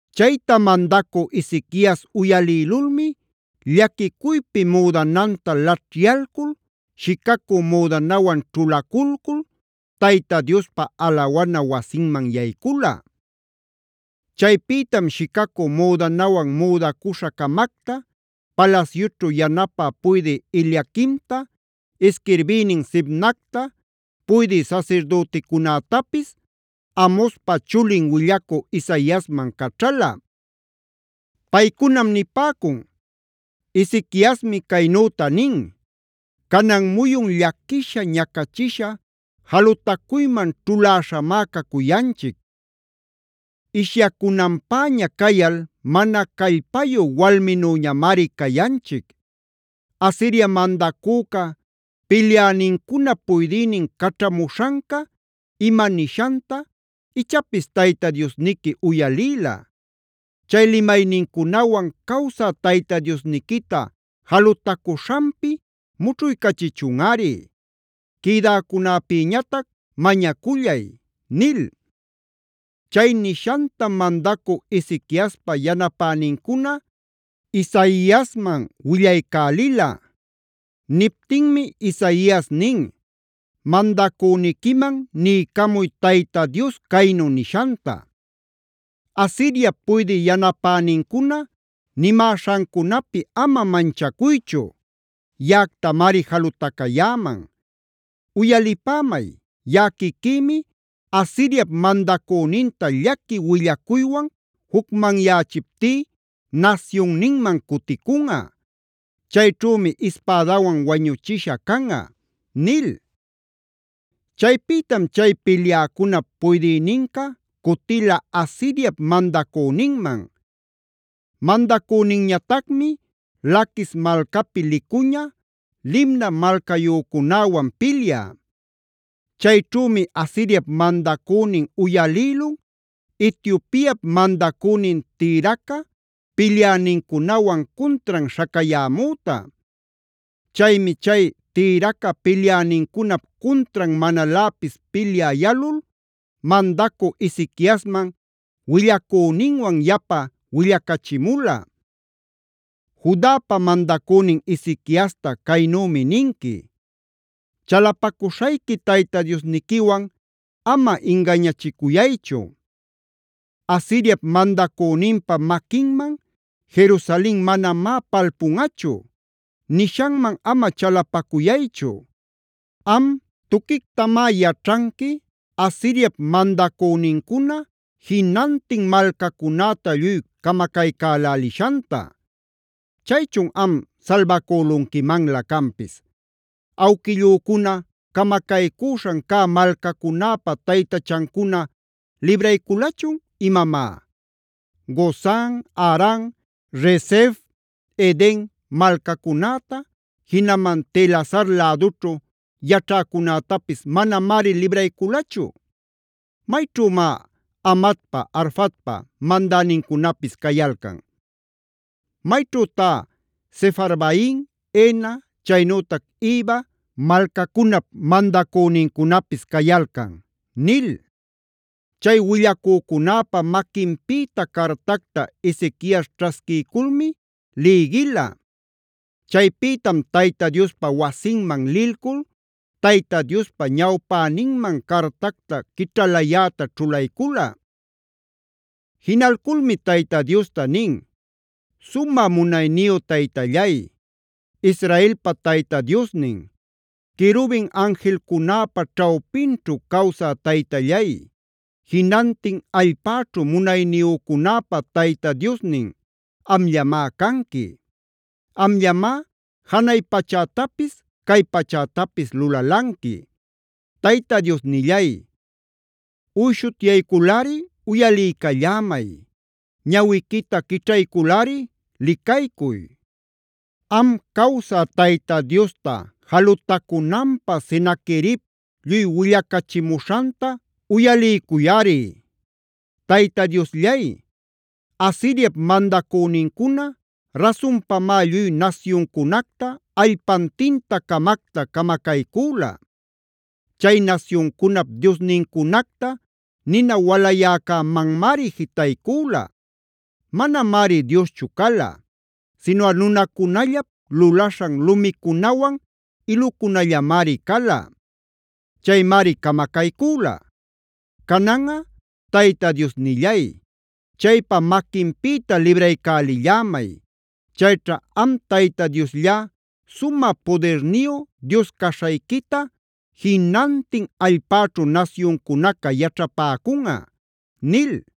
Chayta mandacü Ezequias uyalïlulmi llaquicuypi müdananta laćhyalcul, shicacü müdanawan ćhulaculcul Tayta Diospa alawana wasinman yaycula. Chaypïtam shicacü müdanawan müdacuśha-camacta, palasyućhu yanapä puydï Eliaquimta, isquirbïnin Sebnacta, puydï sasirdüticunätapis Amozpa chulin willacü Isaiasman caćhala. Paycunam nipäcun: “Ezequiasmi caynüta nin: ‘Canan muyun llaquisha, ñacachisha, jalutacuyman ćhuläśhamá cacuyanchic; ishyacunanpäña cayal mana callpayu walminüñamari cayanchic. Asiria mandacüca pilyänincunap puydïnin caćhamuśhanca ima nishanta, ichapis Tayta Diosniqui uyalïla. Chay limaynincunawan cawsa Tayta Diosniquita jalutacuśhanpi mućhuycachichunꞌari. Quïdäcunäpïñatac mañacullay’” nil. Chay nishantam mandacü Ezequiaspa yanapänincuna Isaiasman willaycälila. Niptinmi Isaias nin: “Mandacüniquiman niycamuy Tayta Dios caynu nishanta: ‘Asiriap puydï yanapänincuna nimäśhancunapi ama manchacuychu; yaꞌactamari jalutacayäman. Uyalipämay, yaꞌa quiquïmi Asiriap mandacüninta llaqui willacuywan jucmanyächiptí nasyunninman cuticunꞌa. Chayćhümi ispädawan wañuchisha canꞌa’” nil. Chaypïtam chay pilyäcunap puydïninca cutila Asiriap mandacüninman. Mandacüninñatacmi Laquis malcapi licuña Libna malcayücunäwan pilyä. Chayćhümi Asiriap mandacünin uyalïlun Etiopiap mandacünin Tirhaca pilyänincunawan cuntran śhacayämüta. Chaymi chay Tirhaca pilyänincunap cuntran manaläpis pilyä yalul mandacü Ezequiasman willacüninwan yapa willacachimula: “Judapa mandacünin Ezequiasta caynümi ninqui: ‘Chalapacuśhayqui Tayta Diosniquiwan ama ingañachicuyaychu. “Asiriap mandacüninpa maquinman Jerusalen manamá palpunꞌachu” nishanman ama chalapacuyaychu. Am tuquictamá yaćhanqui Asiriap mandacünincuna jinantin malcacunäta lluy camacaycälälishanta. Chaychun ¿am salbacülunquimanlä canpis? ¿Awquillücuna camacaycüśhan cä malcacunäpa taytachancuna librayculachun imamá? Gozan, Haran, Resef, Eden malcacunäta, jinaman Telasar lädućhu yaćhäcunätapis manamari librayculachu. ¿Mayćhümá Hamatpa, Arfadpa mandänincunapis cayalcan? ¿Mayćhütá Sefarvaim, Hena chaynütac Iva malcacunap mandacünincunapis cayalcan?’” nil. Chay willacücunäpa maquinpïta cartacta Ezequias ćhasquiyculmi lïgila. Chaypïtam Tayta Diospa wasinman lilcul Tayta Diospa ñawpäninman cartacta quićhalayäta ćhulaycula. Jinalculmi Tayta Diosta nin: “Sumä munayniyu Taytallay, Israelpa Tayta Diosnin, querubin anjilcunäpa ćhawpinćhu cawsä Taytallay, jinantin allpäćhu munayniyücunäpa Tayta Diosnin amllamá canqui. Amllamá janay pachätapis cay pachätapis lulalanqui. Tayta Diosnillay, uyshutyayculꞌari uyaliycallämay; ñawiquita quićhayculꞌari licaycuy. Am cawsä Tayta Diosta jalutacunanpä Senaquerib lluy willacachimuśhanta uyaliycuyꞌari. “Tayta Diosllay, Asiriap mandacünincuna rasunpamá lluy nasyuncunacta, allpantinta-camacta camacaycüla. Chay nasyuncunap diosnincunacta nina walayäcämanmari jitaycüla. Manamari dioschu cala, sinuꞌa nunacunallap lulaśhan lumicunawan ilucunallamari cala. Chaymari camacaycüla. Cananꞌa Tayta Diosnillay, chaypa maquinpïta libraycälillämay. Chayćha am Tayta Diosllá sumä pudirniyu Dios caśhayquita jinantin allpäćhu nasyuncunaca yaćhapäcunꞌa” nil.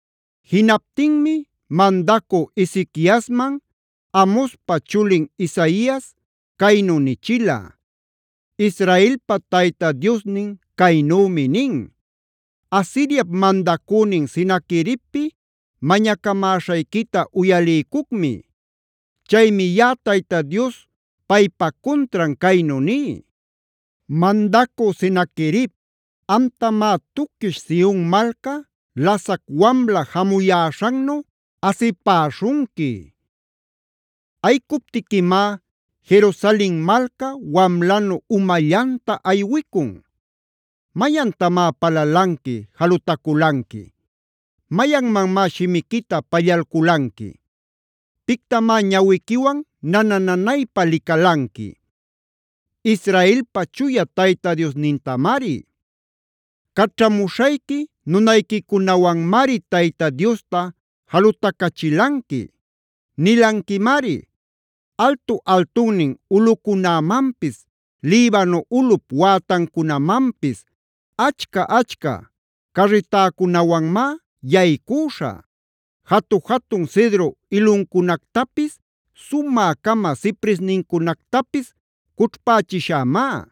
Jinaptinmi mandacü Ezequiasman Amozpa chulin Isaias caynu nichila: “Israelpa Tayta Diosnin caynümi nin: ‘Asiriap mandacünin Senaqueribpi mañacamäśhayquita uyaliycucmi. Chaymi yaꞌa Tayta Diospaypa cuntran caynu ní: “ ‘Mandacü Senaquerib, amtamá tuquish Sion malca lasac wamla jamuyäśhannu asipäśhunqui. Ayicuptiquimá Jerusalen malca, wamlanu umallanta aywicun. ¿Mayantamá palalanqui, jalutaculanqui? ¿Mayanmanmá shimiquita pallalculanqui? ¿Pictamá ñawiquiwan nana-nanaypa licalanqui? ¡Israelpa Chuya Tayta Diosnintamari! Caćhamuśhayqui nunayquicunawanmari Tayta Diosta jalutacachilanqui. Nilanquimari: “Altu-altunnin ulꞌucunämanpis, Libano ulꞌup wätancunamanpis, achca-achca carritäcunawanmá yaycüśhä. Jatu-jatun cedro iluncunactapis, sumä-cama cipresnincunactapis cućhpächishämá.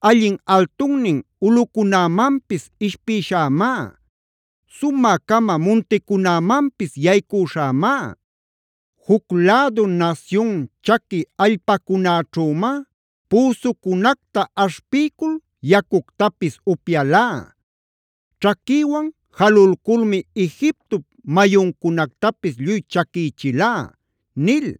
Allin altunnin ulꞌucunämanpis ishpïshämá; sumä-cama munticunämanpis yaycüśhämá. Juc lädu nasyun chaqui allpacunäćhümá püsucunacta aśhpiycul yacuctapis upyalá. Ćhaquïwan jalulculmi Egiptop mayuncunactapis lluy chaquïchilá” nil.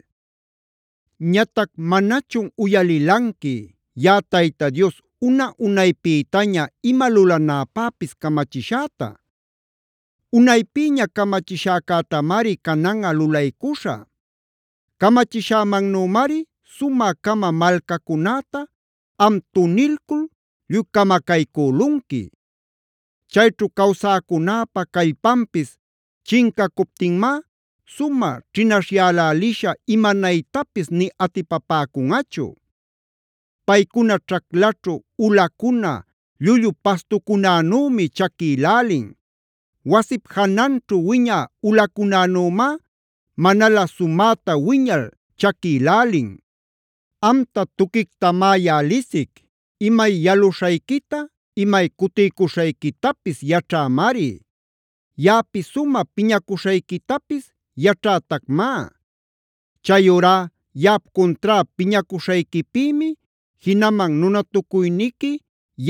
“ ‘Ñatac ¿manachun uyalilanqui yaꞌa Tayta Dios una-unaypïtaña ima lulanäpäpis camachishäta? Unaypïña camachishäcätamari cananꞌa lulaycuśhä. Camachishämannümari sumä-cama malcacunäta, am tunilcul lluy camacaycülunqui. Chayćhu cawsäcunäpa callpanpis chincacuptinmá sumä ćhinaśhyäläliśha imanaytapis nï atipapäcunꞌachu. Paycuna ćhaclaćhu ulacuna, llullu pastucunänümi chaquïlälin; wasip jananćhu wiñä ulacunänümá manalä sumäta wiñal chaquilälin. “ ‘Amta tuquictamá yaꞌa lisic; imay yaluśhayquita imay cutiycuśhayquitapis yaćhämari. Yaꞌapi sumä piñacuśhayquitapis yaćhätacmá. Chayurá yaꞌap cuntrá piñacuśhayquipïmi, jinaman nunatucuyniqui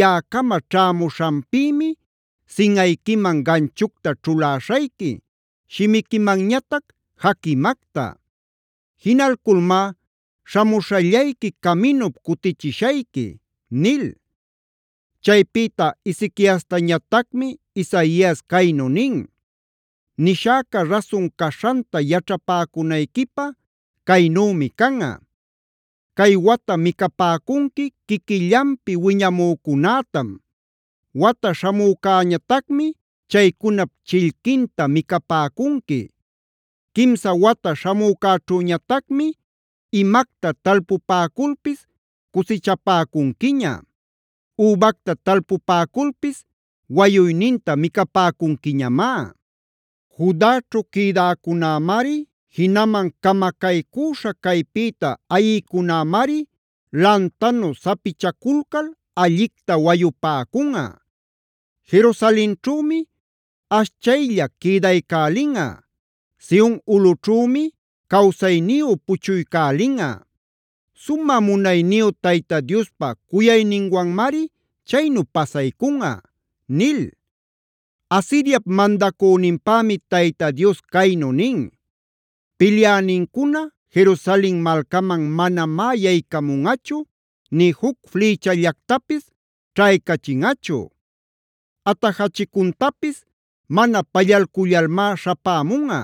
yaꞌacama ćhämuśhanpïmi, sinꞌayquiman ganchucta ćhuläśhayqui, shimiquimanñatac jaquimacta. Jinalculmá śhamuśhallayqui caminup cutichishayqui’” nil. Chaypïta Ezequiastañatacmi Isaias caynu nin: “Nishäca rasun caśhanta yaćhapäcunayquipä caynümi canꞌa. Cay wata micapäcunqui quiquillanpi wiñamücunätam; wata śhamücañatacmi chaycunap chillquinta micapäcunqui. Quimsa wata śhamücäćhüñatacmi imacta talpupäculpis cusichapäcunquiña; übacta talpupäculpis wayuyninta micapäcunquiñamá. Judaćhu quïdäcunämari jinaman camacaycüśha caypïta ayïcunämari lantanu sapichaculcal allicta wayupäcunꞌa. Jerusalenćhümi ashchaylla quïdaycälinꞌa; Sion ulꞌućhümi cawsayniyu puchuycälinꞌa. Sumä munayniyu Tayta Diospa cuyayninwanmari chaynu pasaycunꞌa” nil. Asiriap mandacüninpämi Tayta Dios caynu nin: “Pilyänincuna Jerusalen malcaman manamá yaycamunꞌachu nï juc flïchallactapis ćhaycachinꞌachu; atajachicuntapis mana pallalcullalmá śhapämunꞌa;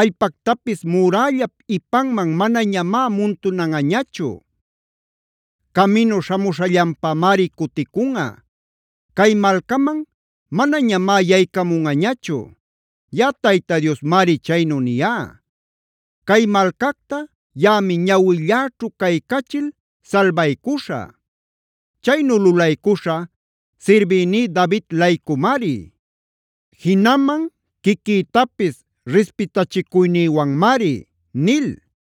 allpactapis murällap ipanman manañamá muntunanꞌañachu. Caminu śhamuśhallanpamari cuticunꞌa; cay malcaman manañamá yaycamunꞌañachu. Yaꞌa Tayta Diosmari chaynu niyá. Cay malcacta yaꞌami ñawilläćhu caycachil salbaycuśhä. Chaynu lulaycuśhä sirbïní David-laycumari, jinaman quiquïtapis rispitachicuynïwanmari” nil.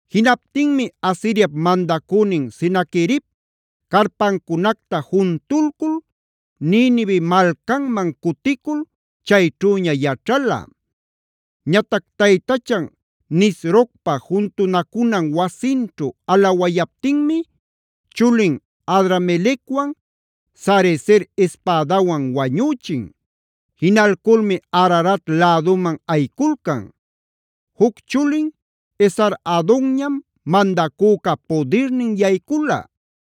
Jinaptinmi Asiriap mandacünin Senaquerib, carpancunacta juntulcul, Ninive malcanman cuticul, chayćhüña yaćhala. Ñatac taytachan Nisrocpa juntunacunan wasinćhu alawayaptinmi, chulin Adramelecwan Sarezer ispädawan wañüchin. Jinalculmi Ararat läduman ayiculcan. Juc chulin Esar-hadonñam mandacüca pudirnin yaycula.